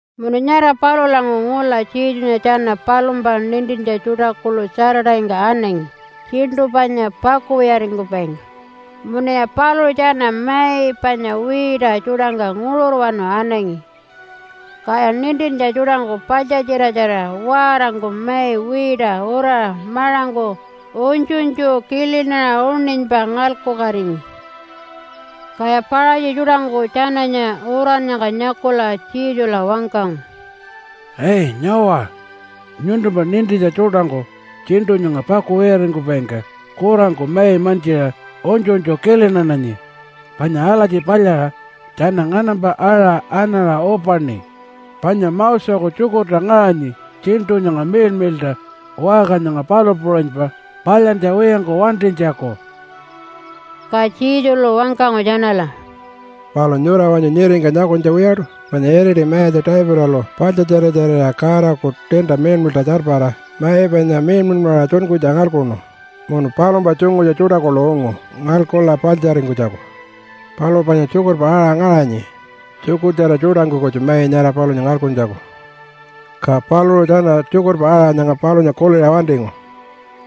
Munu nyara palulanguṟu ngula Jesunya tjana palumpa nintintja tjuṯa kuḻu Saturday-ngka anangi tjiṉṯu panya pakuwiyaringkupaingka. Munuya paluṟu tjana mai panya wiita tjuṯangka nguṟurwanu anangi. Kaya nintintja tjuṯangku paḻtjatjiratjarira waarangku mai wiita uraṟa maṟangku unytjunytju kilinaṟa uṉinypa ngalkukatingi. Kaya Paṟatji tjuṯangku tjananya urannyangka nyakula Jesula wangkangu, “Ai, nyawa! Nyuntumpa nintintja tjuṯangku tjiṉṯu nyanga pakuwiyaringkupaingka kurangku mai mantjiṟa unytjunytju kilinananyi, panya alatji palyaṟa tjana nganampa aṟa anaṟa upaṉi, panya Moseku tjukurta ngaṟanyi tjiṉṯu nyanga miḻmiḻṯa waṟka nyanga palu puṟunypa palyantja wiyangku wantinytjaku.” Ka Jesulu wangkangu tjanala, “Palu nyura wanyu nyiringka nyakunytja wiyaṯu panya iriti mayatja Davidalu paḻtjatjiratjarira Godaku tiinta miḻmiḻṯa tjarpara mai panya miḻmiḻmaṟa tjunkunytja ngalkuṉu munu palumpa tjungutja tjuṯa kuḻu ungu ngalkula paḻtjaringkunytjaku. Palu panya tjukurpa aṟa ngaṟanyi tjukurtjara tjuṯangku kutju mai nyara palunya ngalkuntjaku. Ka paluṟu tjana tjukurpa aṟa nyanga palunya kuliṟa wantingu,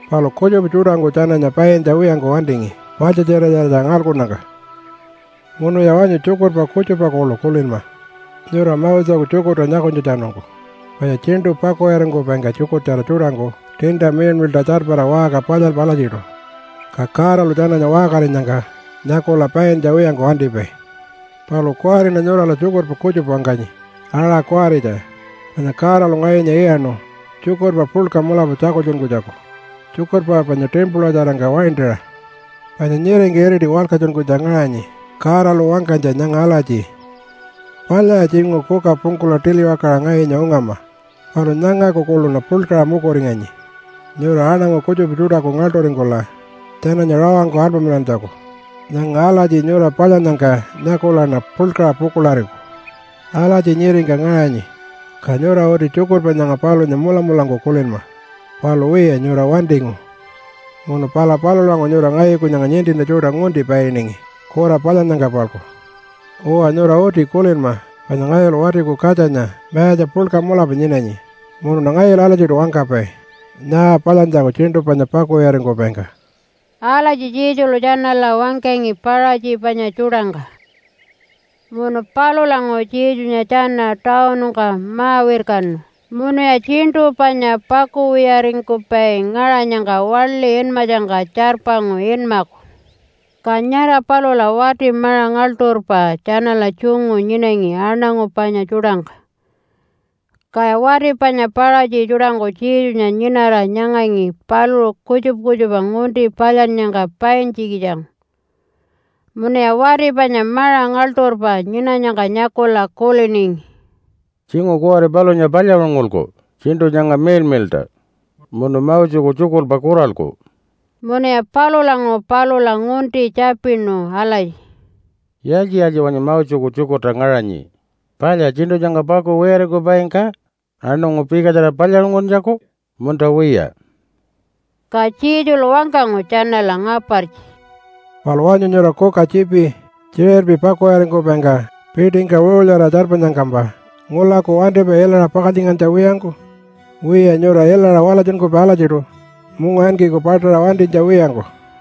palu kutjupa tjuṯangku tjananya paintja wiyangku wantingi paḻtjatjiratjarira ngalkunnyangka. “Munuya wanyu tjukurpa kutjupa kuḻu kulinma nyura Moseku tjukurta nyakunytjatjanungku, panya tjiṉṯu pakuwiyaringkupaingka tjukurtjara tjuṯangku tiinta miḻmiḻṯa tjarpara waṟka palyalpai alatjiṯu, ka Godalu tjananya waṟkarinyangka nyakula paintja wiyangku wantipai. Palu kuwariṉa nyurala tjukurpa kutjupa wangkanyi aṟa kuwaritja. Panya Godalu ngayunya iyaṉu tjukurpa puḻka mulapa tjakultjunkunytjaku tjukurpa panya timpulatjarangka waintaṟa. Panya nyiringka iriti walkatjunkunytja ngaṟanyi Godalu wangkanytja nyanga alatji, ‘Palyaya tjinguṟu kuka pungkula tiliwakaṟa ngayunya ungama, palu nyangaku kuḻuṉa puḻkaṟa mukuringanyi nyura aṉangu kutjupa tjuṯaku ngaḻṯuringkula tjananya rawangku alpamilantjaku. Nyanga alatji nyura palyannyangka nyakulaṉa puḻkaṟa pukuḻariku.’ Alatji nyiringka ngaṟanyi. Ka nyura uti tjukurpa nyanga palunya mulamulangku kulinma. Palu wiya, nyura wantingu munu pala palulanguṟu nyura ngayuku nyanga nintintja tjuṯa ngunti painingi kura palyannyangka-palku. Uwa, nyura uti kulinma panya ngayulu Watiku Katjanya mayatja puḻka mulapa nyinanyi, munuṉa ngayulu alatjiṯu wangkapai nyaa palyantjaku tjiṉṯu panya pakuwiyaringkupaingka.” Alatji Jesulu tjanala wangkangi Paṟatji panya tjuṯangka. Munu palulanguṟu Jesunya tjana tawunungka ma-wirkanu munuya tjiṉṯu panya pakuwiyaringkupai ngaṟanyangka waḻi inmatjangka tjarpangu inmaku. Ka nyara palula wati maṟa ngaḻṯurpa tjanala tjungu nyinangi aṉangu panya tjuṯangka. Kaya wati panya Paṟatji tjuṯangku Jesunya nyinara nyangangi paluṟu kutjupa kutjupa ngunti palyannyangka paintjikitjangku. Munuya wati panya maṟa ngaḻṯurpa nyinanyangka nyakula kuliningi, “Tjinguṟu kuwari palunya palyaṟungulku tjiṉṯu nyanga miḻmiḻṯa munu Moseku tjukurpa kuralku.” Munuya palulanguṟu palula ngunti tjapinu alatji, “Yaaltji-yaaltji wanyu Moseku tjukurta ngaṟanyi? Palya tjiṉṯu nyanga pakuwiyaringkupaingka aṉangu pikatjara palyaṟunguntjaku, munta wiya?” Ka Jesulu wangkangu tjanala ngapartji, “Palu wanyu nyura kuka tjiipi tjiṟirpi pakuwiyaringkupaingka piṯingka wiṟulyaraṟa tjarpanyangkampa ngulaku wantipai ilaṟa pakaltjingantja wiyangku? Wiya, nyura ilaṟa walatjunkupai alatjiṯu mungawinkiku paṯaṟa wantinytja wiyangku.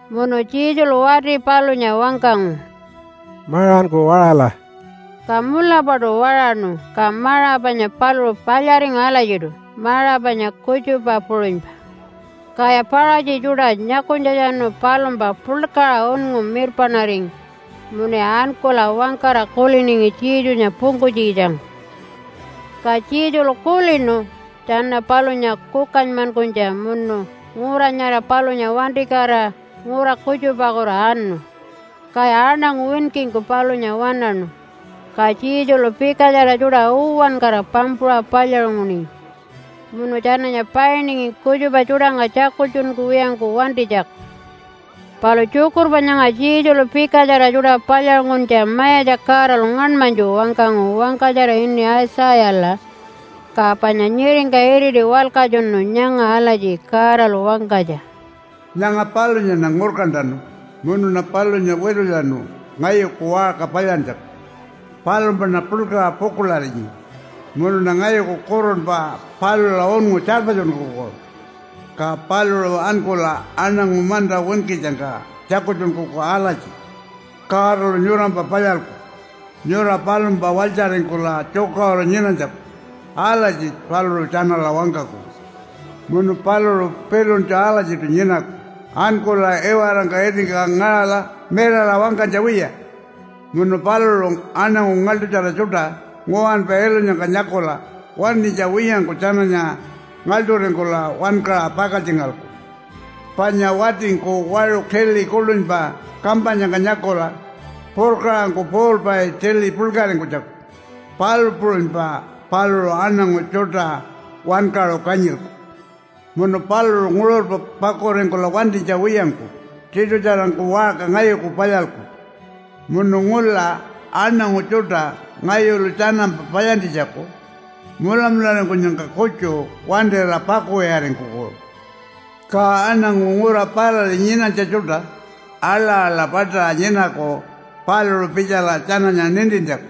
Munu Jesulu wati palunya wangkangu, “Maṟanku waṟala!” Ka mulapaṯu waṟaṉu, ka maṟa panya paluṟu palyaringu alatjiṯu maṟa panya kutjupa puṟunypa. Kaya Paṟatji tjuṯa nyakunytjatjanu palumpa puḻkaṟa unngu mirpaṉaringi munuya ankula wangkara kuliningi Jesunya pungkunytjikitjangku. Ka Jesulu kulinu tjana palunya kukanymankunytja munu ngura nyara palunya wantikatira ngura kutjupakutu anu. Kaya aṉangu winkingku palunya waṉaṉu, ka Jesulu pikatjara tjuṯa uwankara pampuṟa palyaṟunguningi. Munu tjananya painingi kutjupa tjuṯangka tjakultjunkuwiyangku wantinytjaku. Palu tjukurpa nyanga Jesulu pikatjara tjuṯa palyaṟunguntja Mayatja Godalu ngaṉmanytju wangkangu wangkatjara ini Aitjayala, ka panya nyiringka iriti walkatjunu nyanga alatji Godalu wangkanytja, “Nyanga palunyaṉa ngurkantanu munuṉa palunya witulyanu ngayuku waṟka palyantjaku. Palumpaṉa puḻkaṟa pukuḻarinyi, munuṉa ngayuku kurunpa palula unngu tjarpatjunkuku. Ka paluṟu ankula aṉangu manta winkitjangka tjakultjunkuku alatji, ‘Godalu nyurampa palyalku nyura palumpa walytjaringkula tjukaṟuru nyinanytjaku.’ Alatji paluṟu tjanala wangkaku. Munu paluṟu piluntju alatjiṯu nyinaku ankula iwarangka itingka ngaṟala mirara wangkanytja wiya. Munu paluṟu aṉangu ngaḻṯutjara tjuṯa nguwanpa ilunyangka nyakula wantinytja wiyangku tjananya ngaḻṯuringkula wankaṟa pakaltjingalku, panya watingku waṟu tili kuḻunypa kampanyangka nyakula purkaṟangku puulpai tili puḻkaringkunytjaku, palu puṟunypa paluṟu aṉangu tjuṯa wankaṟu kanyilku. Munu paluṟu nguṟurpa pakuringkula wantinytja wiyangku tiṯutjarangku waṟka ngayuku palyalku munu ngula aṉangu tjuṯa ngayulu tjanampa palyantjitjaku mulamularingkunyangka kutju wantira pakuwiyaringkuku. Ka aṉangu ngura parari nyinanytja tjuṯa aḻa-aḻa paṯaṟa nyinaku paluṟu pitjala tjananya nintintjaku.”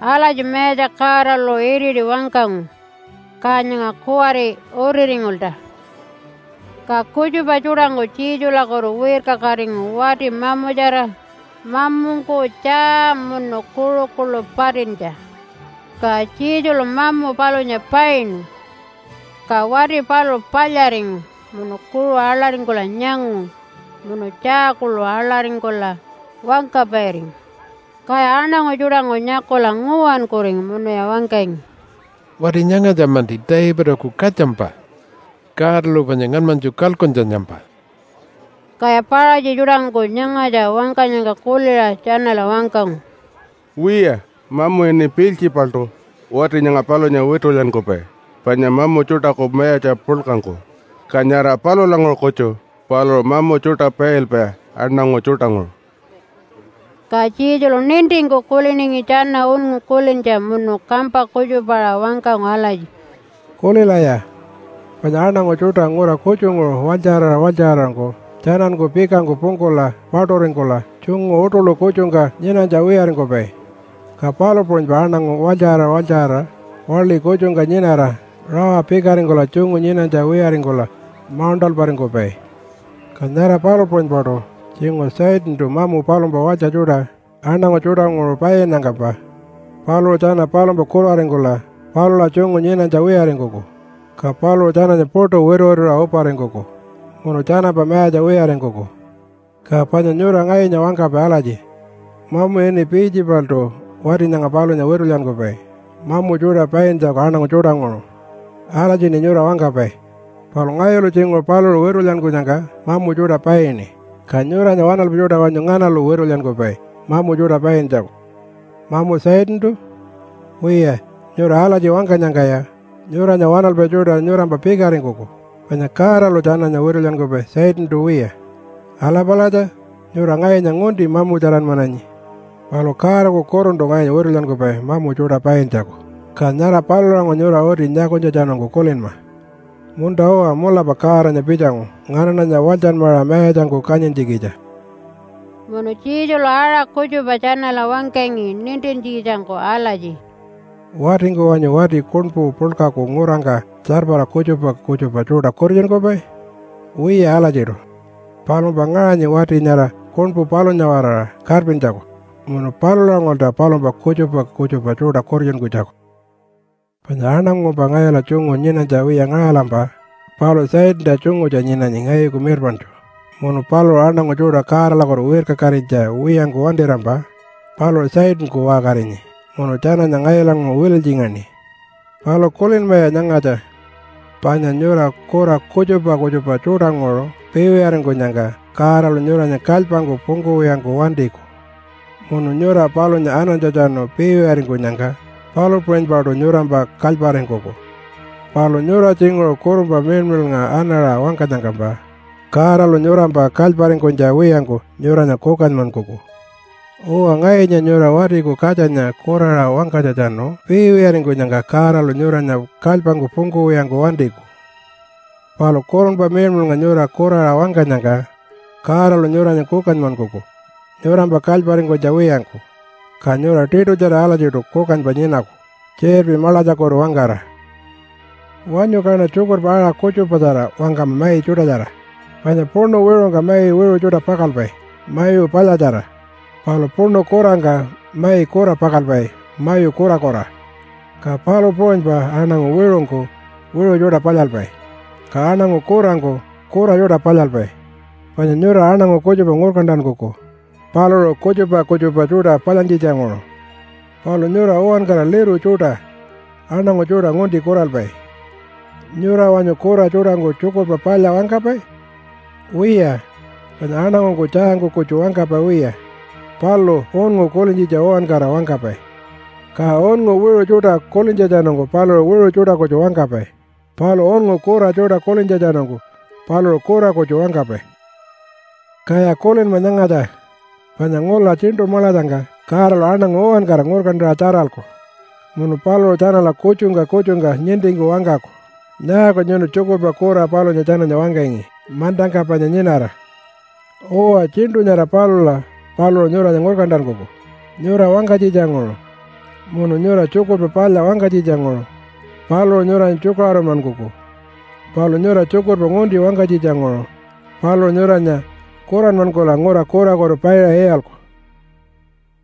Alatji Mayatja Godalu iriti wangkangu, ka nyanga kuwari utiringulta. Ka kutjupa tjuṯangku Jesulakutu wirkakatingu wati mamutjara, mamungku tjaa munu kuṟu kuḻu patintja. Ka Jesulu mamu palunya painu, ka wati paluṟu palyaringu munu kuṟu aḻaringkula nyangu munu tjaa kuḻu aḻaringkula wangkapairingu. Kaya aṉangu tjuṯangku nyakula nguwankuringu munuya wangkangi, “Wati nyangatja-manti Davidaku katjampa Godalu panya ngaṉmanytju kalkuntjanyampa.” Kaya Paṟatji tjuṯangku nyangatja wangkanyangka kuliṟa tjanala wangkangu, “Wiya, mamu ini Piiltjipaltu wati nyanga palunya witulyankupai panya mamu tjuṯaku mayatja puḻkangku, ka nyara palulanguṟu kutju paluṟu mamu tjuṯa pailpai aṉangu tjuṯanguṟu.” Ka Jesulu nintingku kuliningi tjana unngu kulintja munu kampa kutjupaṟa wangkangu alatji, “Kulilaya! Panya aṉangu tjuṯa ngura kutjunguṟu walytjaṟara walytjaṟarangku tjananku pikangku pungkula paṯuringkula tjungu uṯuḻu kutjungka nyinanytja wiyaringkupai. Ka palu puṟunypa aṉangu walytjaṟara walytjaṟara waḻi kutjungka nyinara rawa pikaringkula tjungu nyinanytja wiyaringkula mauṉṯalparingkupai. Ka nyara palu puṟunypaṯu tjinguṟu Satantu mamu palumpa walytja tjuṯa aṉangu tjuṯanguṟu painnyangkampa paluṟu tjana palumpa kuraringkula palula tjungu nyinanytja wiyaringkuku, ka paluṟu tjananya puṯu wituwituṟa uparingkuku munu tjanampa mayatja wiyaringkuku. Ka panya nyura ngayunya wangkapai alatji, ‘Mamu ini Piiltjipaltu wati nyanga palunya witulyankupai mamu tjuṯa paintjaku aṉangu tjuṯanguṟu.’ Alatjiṉi nyura wangkapai. Palu ngayulu tjinguṟu paluṟu witulyankunyangka mamu tjuṯa paini, ka nyuranya waṉalpai tjuṯa wanyu nganalu witulyankupai mamu tjuṯa paintjaku? Mamu Satantu? Wiya, nyura alatji wangkanyangkaya nyuranya waṉalpai tjuṯa nyurampa pikaringkuku, panya Godalu tjananya witulyankupai Satantu wiya. Ala palatja! Nyura ngayunya ngunti mamutjaranmananyi. Palu Godaku Kuruntu ngayunya witulyankupai mamu tjuṯa paintjaku, ka nyara palulanguṟu nyura uti nyakunytjatjanungku kulinma, ‘Munta-uwa, mulapa Godanya pitjangu nganaṉanya walytjanmaṟa mayatjangku kanyintjikitja.’” Munu Jesulu aṟa kutjupa tjanala wangkangi nintintjikitjangku alatji, “Watingku wanyu wati kuṉpu puḻkaku ngurangka tjarpara kutjupa kutjupa tjuṯa kutitjunkupai? Wiya alatjiṯu. Palumpa ngaṟanyi wati nyara kuṉpu palunya-waraṟa karpintjaku munu palulanguṟulta palumpa kutjupa kutjupa tjuṯa kutitjunkunytjaku. “Panya aṉangumpa ngayula tjungu nyinanytja wiya ngaṟalampa paluṟu Satanta tjungutja nyinanyi ngayuku mirpaṉtju. Munu paluṟu aṉangu tjuṯa Godalakutu wirkakatinytja wiyangku wantirampa paluṟu Satanku waṟkarinyi munu tjananya ngayulanguṟu wililytjingaṉi. Palu kulinmaya nyangatja, panya nyura kura kutjupa kutjupa tjuṯanguṟu piiwiyaringkunyangka Godalu nyuranya kalypangku pungkuwiyangku wantiku. Munu nyura palunya anantjatjanu piiwiyaringkunyangka palu puṟunypaṯu nyurampa kalyparingkuku. Palu nyura tjinguṟu Kurunpa Miḻmiḻnga anaṟa wangkanyangkampa Godalu nyurampa kalyparingkunytja wiyangku nyuranya kukanymankuku. Uwa, ngayunya nyura Watiku Katjanya kuraṟa wangkanytjatjanu piiwiyaringkunyangka Godalu nyuranya kalypangku pungkuwiyangku wantiku. Palu Kurunpa Miḻmiḻnga nyura kuraṟa wangkanyangka Godalu nyuranya kukanymankuku nyurampa kalyparingkunytja wiyangku, ka nyura tiṯutjara alatjiṯu kukanypa nyinaku tjiṟirpi maḻatjakutu-wangkara. “Wanyu kaṉa tjukurpa aṟa kutjupatjara wangkama mai tjuṯatjara, panya puṉu wiṟungka mai wiṟu tjuṯa pakalpai mayu palyatjara, palu puṉu kurangka mai kura pakalpai mayu kurakura. Ka palu puṟunypa aṉangu wiṟungku wiṟu tjuṯa palyalpai, ka aṉangu kurangku kura tjuṯa palyalpai. Panya nyura aṉangu kutjupa ngurkantankuku paluṟu kutjupa kutjupa tjuṯa palyantjitjanguṟu. Palu nyura uwankara liru tjuṯa aṉangu tjuṯa ngunti kuralpai! Nyura wanyu kura tjuṯangku tjukurpa palya wangkapai? Wiya, panya aṉangungku tjaangku kutju wangkapai wiya, palu unngu kulintjitja uwankara wangkapai. Ka unngu wiṟu tjuṯa kulintjatjanungku paluṟu wiṟu tjuṯa kutju wangkapai, palu unngu kura tjuṯa kulintjatjanungku paluṟu kura kutju wangkapai. “Kaya kulinma nyangatja, panya ngula tjiṉṯu maḻatjangka Godalu aṉangu uwankara ngurkantaṟa tjaralku munu paluṟu tjanala kutjungka kutjungka nintingku wangkaku, ‘Nyaaku nyuntu tjukurpa kura palunya tjananya wangkangi mantangka panya nyinara?’ Uwa, tjiṉṯu nyara palula paluṟu nyuranya ngurkantankuku nyura wangkanytjitjanguṟu. Munu nyura tjukurpa palya wangkanytjitjanguṟu paluṟu nyuranya tjukaṟurunmankuku, palu nyura tjukurpa ngunti wangkanytjitjanguṟu paluṟu nyuranya kuranmankula ngura kurakutu paiṟa iyalku.”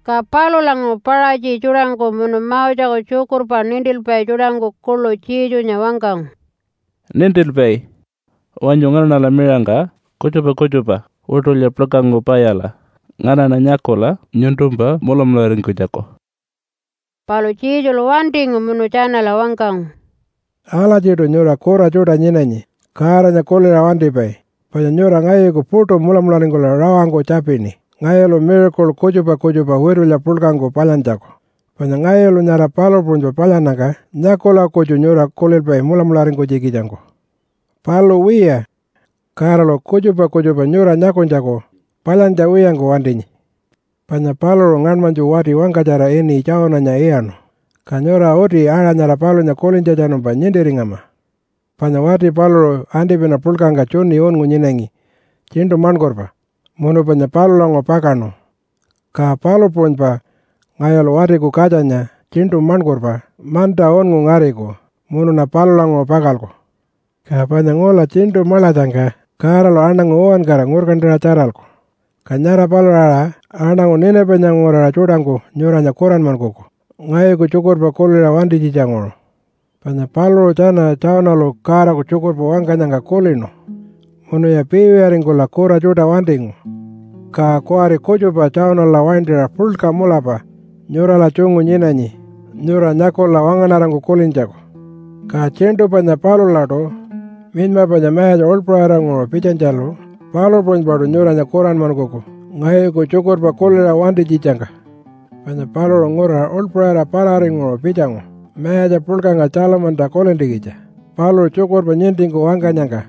Ka palulanguṟu Paṟatji tjuṯangku munu Moseku tjukurpa nintilpai tjuṯangku kuḻu Jesunya wangkangu, “Nintilpai! Wanyu nganaṉala miṟangka kutjupa kutjupa witulya puḻkangku palyala nganaṉa nyakula nyuntumpa mulamularingkunytjaku.” Palu Jesulu wantingu munu tjanala wangkangu, “Alatjiṯu nyura kura tjuṯa nyinanyi Godanya kuliṟa wantipai, panya nyura ngayuku puṯu mulamularingkula rawangku tjapini ngayulu miracle kutjupa kutjupa witulya puḻkangku palyantjaku, panya ngayulu nyara palu puṟunypa palyannyangka nyakula kutju nyura kulilpai mulamularingkunytjikitjangku. Palu wiya, Godalu kutjupa kutjupa nyura nyakunytjaku palyantja wiyangku wantinyi, panya paluṟu ngaṉmanytju wati wangkatjara ini Jonah-nya iyaṉu, ka nyura uti aṟa nyara palunya kulintjatjanumpa nintiringama. Panya wati paluṟu antipina puḻkangka tjuni unngu nyinangi tjiṉṯu maṉkurpa munu panya palulanguṟu pakaṉu, ka palu puṟunypa ngayulu Watiku Katjanya tjiṉṯu maṉkurpa manta unngu ngariku munuṉa palulanguṟu pakalku. Ka panya ngula tjiṉṯu maḻatjangka Godalu aṉangu uwankara ngurkantaṟa tjaralku, ka nyara palula aṟa aṉangu Ninapanya nguraṟa tjuṯangku nyuranya kuranmankuku ngayuku tjukurpa kuliṟa wantinytjitjanguṟu. Panya paluṟu tjana Jonah-lu Godaku tjukurpa wangkanyangka kulinu munuya piiwiyaringkula kura tjuṯa wantingu. Ka kuwari kutjupa Jonah-la waintaṟa puḻka mulapa nyurala tjungu nyinanyi nyura nyakula wangaṉarangku kulintjaku. Ka tjiṉṯu panya palulaṯu minyma panya mayatja uḻpaṟiranguṟu pitjanytjalu palu puṟunypaṯu nyuranya kuranmankuku ngayuku tjukurpa kuliṟa wantinytjitjangka. Panya paluṟu ngura uḻpaṟira pararinguṟu pitjangu mayatja puḻkangka Tjalamanta kulintjikitja paluṟu tjukurpa nintingku wangkanyangka.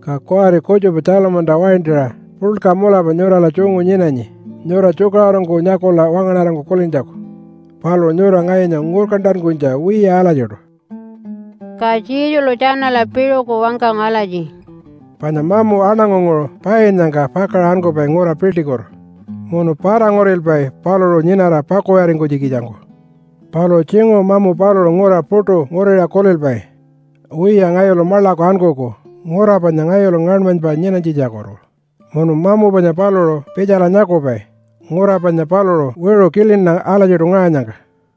Ka kuwari kutjupa Tjalamanta waintaṟa puḻka mulapa nyurala tjungu nyinanyi nyura tjukaṟurungku nyakula wangaṉarangku kulintjaku. Palu nyura ngayunya ngurkantankunytja wiya alatjiṯu.” Ka Jesulu tjanala piṟuku wangkangu alatji, “Panya mamu aṉangunguṟu painnyangka pakaṟa ankupai ngura piḻṯikutu munu para-ngurilpai paluṟu nyinara pakuwiyaringkunytjikitjangku. Palu tjinguṟu mamu paluṟu ngura puṯu nguriṟa kulilpai, ‘Wiya, ngayulu maḻaku ankuku ngura panya ngayulu ngaṉmanypa nyinanytjitjakutu.’ Munu mamu panya paluṟu pitjala nyakupai ngura panya paluṟu wiṟu kilina alatjiṯu ngaṟanyangka.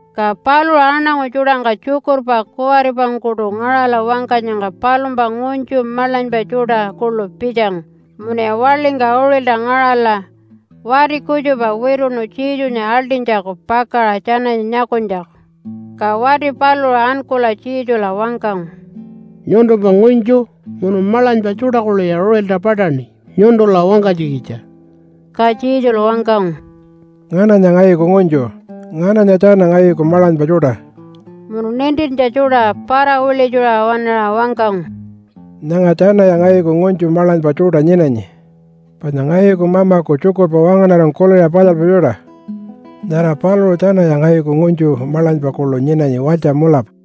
Ka paluṟu aṉangu tjuṯangka tjukurpa kuwaripangkuṯu ngaṟala wangkanyangka palumpa ngunytju maḻanypa tjuṯa kuḻu pitjangu, munuya waḻingka uṟilta ngaṟala wati kutjupa wituṉu Jesunya aḻṯinytjaku pakaṟa tjananya nyakunytjaku. Ka wati paluṟu ankula Jesula wangkangu, “Nyuntumpa ngunytju munu maḻanypa tjuṯa kuḻuya uṟilta paṯaṉi nyuntula wangkanytjikitja.” Ka Jesulu wangkangu, “Ngananya ngayuku ngunytju? Ngananya tjana ngayuku maḻanypa tjuṯa?” Munu nintintja tjuṯa para-wiḻitjuṟa waṉaṟa wangkangu, “Nyanga tjanaya ngayuku ngunytju maḻanypa tjuṯa nyinanyi. Panya ngayuku mamaku tjukurpa wangaṉarangku kuliṟa palyalpai tjuṯa, nyara paluṟu tjanaya ngayuku ngunytju maḻanypa kuḻu nyinanyi walytja mulapa.”